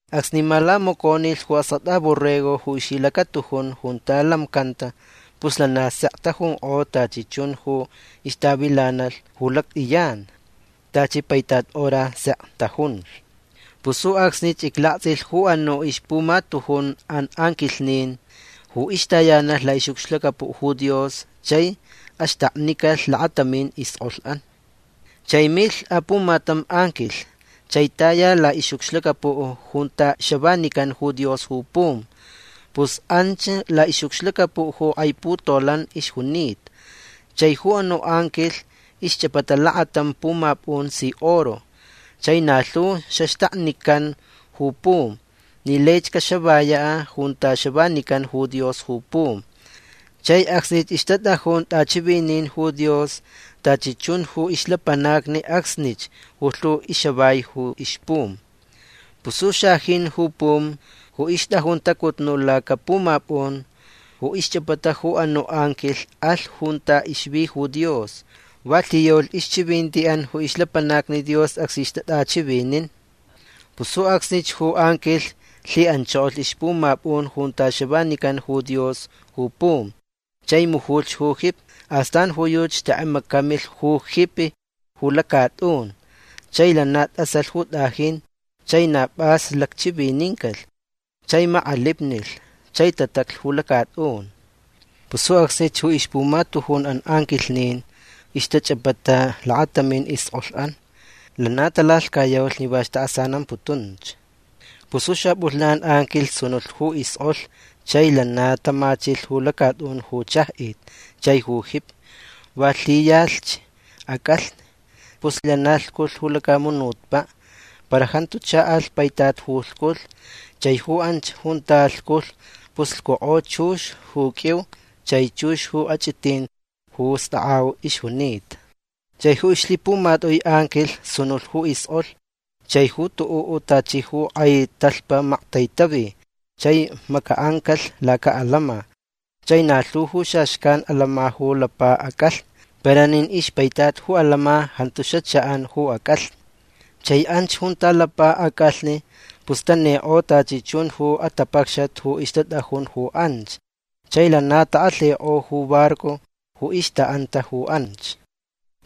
Acsni malamaconilh ju Askʼatʼa Borrego ju ixlhilacatujun junta lamcanta pus lana sek tajunkʼo tachi chun ju ixtavilanalh ju lactʼiyan. Tachi paitat hora sek tajunlh. Pus ju acsnich iclaktsʼilh ju anuʼ ixpumatujunʼan anquilhnin ju ixtayanalh laʼixʼucxlacapuʼ ju Dios chai axtaknicalh lakatamin iskʼolhʼan. Chai milh apumatam anquilh chai taya laʼixʼucxlacapuʼ junta xavanican ju Dios ju pum. Pus anch laʼixʼucxlacapuʼ ju kʼai putolan ixjunita. Chai ju anuʼ anquilh ixchʼapata lakatam pumapʼun si oro. Chai na lhu xaxtaknican ju pum ni laich caxavayaʼ junta xavanican ju Dios ju pum. Chai acsni ixtatʼajun tʼachivinin ju Dios tachi chun ju ixlapanacni acsnich ju lhu ixavai ju ixpum. Pus ju xajin ju pum ju ixtʼajun tʼacutnuʼ lacapumapʼun ju ixchʼapata ju anuʼ anquilh alh junta ixvi ju Dios. Va lhiyaulh ixchivintiʼan ju ixlapanacni Dios acsni ixtatʼachivinin. Pus ju acsnich ju anquilh lhiʼanchokolh ixpumapʼun junta xavanican ju Dios ju pum chai mujulh ju jipi. Astan ju yuchi xtʼekʼemacamilh ju jipi ju lacatʼun. Chai lana tʼasalh ju tʼajin. Chai na pʼas lacchivinincalh. Chai makʼalipnilh. Chai tataclh ju lacatʼun. Pus ju acsnich ju ixpumatujunʼan anquilhnin ju ixtachʼapata lakatamin iskʼolhʼan lana talalhcayaulh ni va ixtaʼasanamputunch. Pus ju xapʼulhnan anquilh sunulh ju iskʼolh chai lana tamachilh ju lacatʼun ju chajʼit chai ju jipi. Va lhiyalhch acʼalhni. Pus lana lhculh ju lacamunutpaʼ. Para jantu chaʼalh paitat ju lhculh. Chai anch junta lhculh pus lhcukʼo chux ju qʼuiu chai chux ju achʼitin ju stakʼau ixjunita. Chai ju ixlhipumatʼui anquilh sunulh ju iskʼolh chai ju tuʼuʼ tachi ju kʼai talhpa maktaitavi chai macaʼancalh lacaʼalama. Chai na lhu ju xaxcan alama ju lapa acʼalhni. Para nin ixpaitat ju alama jantu xachaʼan ju acʼalhni. Chai anch junta lapa acʼalhni pus tanikʼo tachi chun ju atapacxat ju ixtatʼajun ju anch. Chai lana takʼalhikʼo ju barco ju ixtaʼanta ju anch.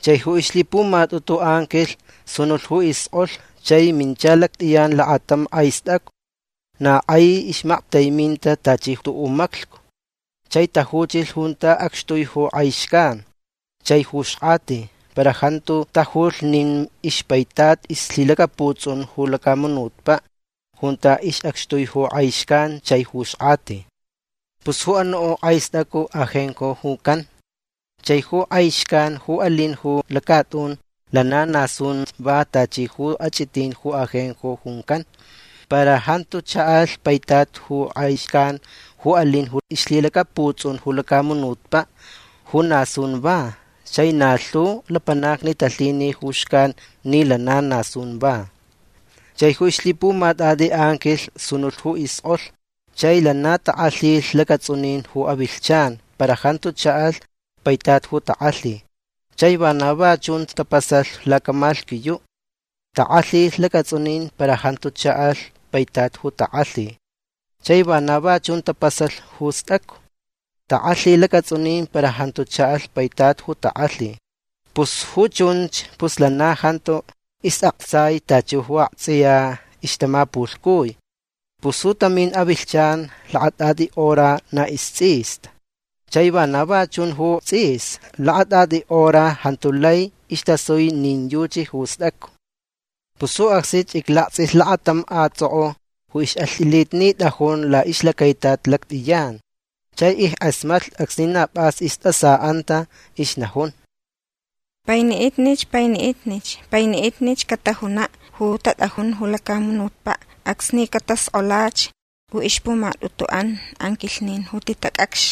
Chai ju ixlhipumatʼutu anquilh sunulh ju iskʼolh chai mincha lactʼiyan lakatam kʼai stʼacu. Na kʼai ixmactaiminta tachi tuʼuʼ maclhcu. Chai tajuchilh junta acxtui ju kʼai xcan chai ju xkʼati. Para jantu tajulh nin ixpaitat ixlhilacaputsʼun ju lacamunutpaʼ junta acxtui ju kʼai xcan chai ju xkʼati. Pus ju anuʼ kʼai stʼacu Ajenjo juncan. Chai ju kʼai xcan ju alin ju lacatʼun lana na sunch va tachi ju achʼitin ju ajenjo juncan. Para jantu chaʼalh paitat ju kʼai xcan ju alin ju ixlhilacaputsʼun ju lacamunutpaʼ ju na sun va. Chai na lhu lapanacni talhini ju xcan ni lana na sun va. Chai ju ixlhipumatʼatʼi anquilh sunulh ju iskʼolh chai lana takʼalhilh lacatsʼunin ju avilhchan para jantu chaʼalh paitat ju takʼalhi. Chai vana va chunch tapasalh lacamalhquiyuʼ. Takʼalhilh lacatsʼunin para jantu chaʼalh paitat ju takʼalhi. Chai vana va chun tapasalh ju stʼacu. Takʼalhi lacatsʼunin para jantu chaʼalh paitat ju takʼalhi. Pus ju chunch pus lana jantu isʼaktsai tachi ju aktsʼiya ixtamapulhcui. Pus ju tamin avilhchan lakatʼatʼi hora na istsʼista. Chai vana va chun ju tsʼis. Lakatʼatʼi hora jantu lai istasui nin yuchi ju stʼacu. Pus ju acsnich iclaktsʼilh lakatam kʼatsʼokʼo ju ixʼalhtʼilitnitʼajun laʼixlacaitat lactʼiyan. Chai ickʼasmatlh acsni na pʼas istʼasaʼanta. Ixnajun: ―Painiʼitnich. Painiʼitnich. Painiʼitnich catajunaʼ ju tatʼajun ju lacamunutpaʼ acsni cataskʼolach ju ixpumatʼutuʼan anquilhnin ju titacʼacx.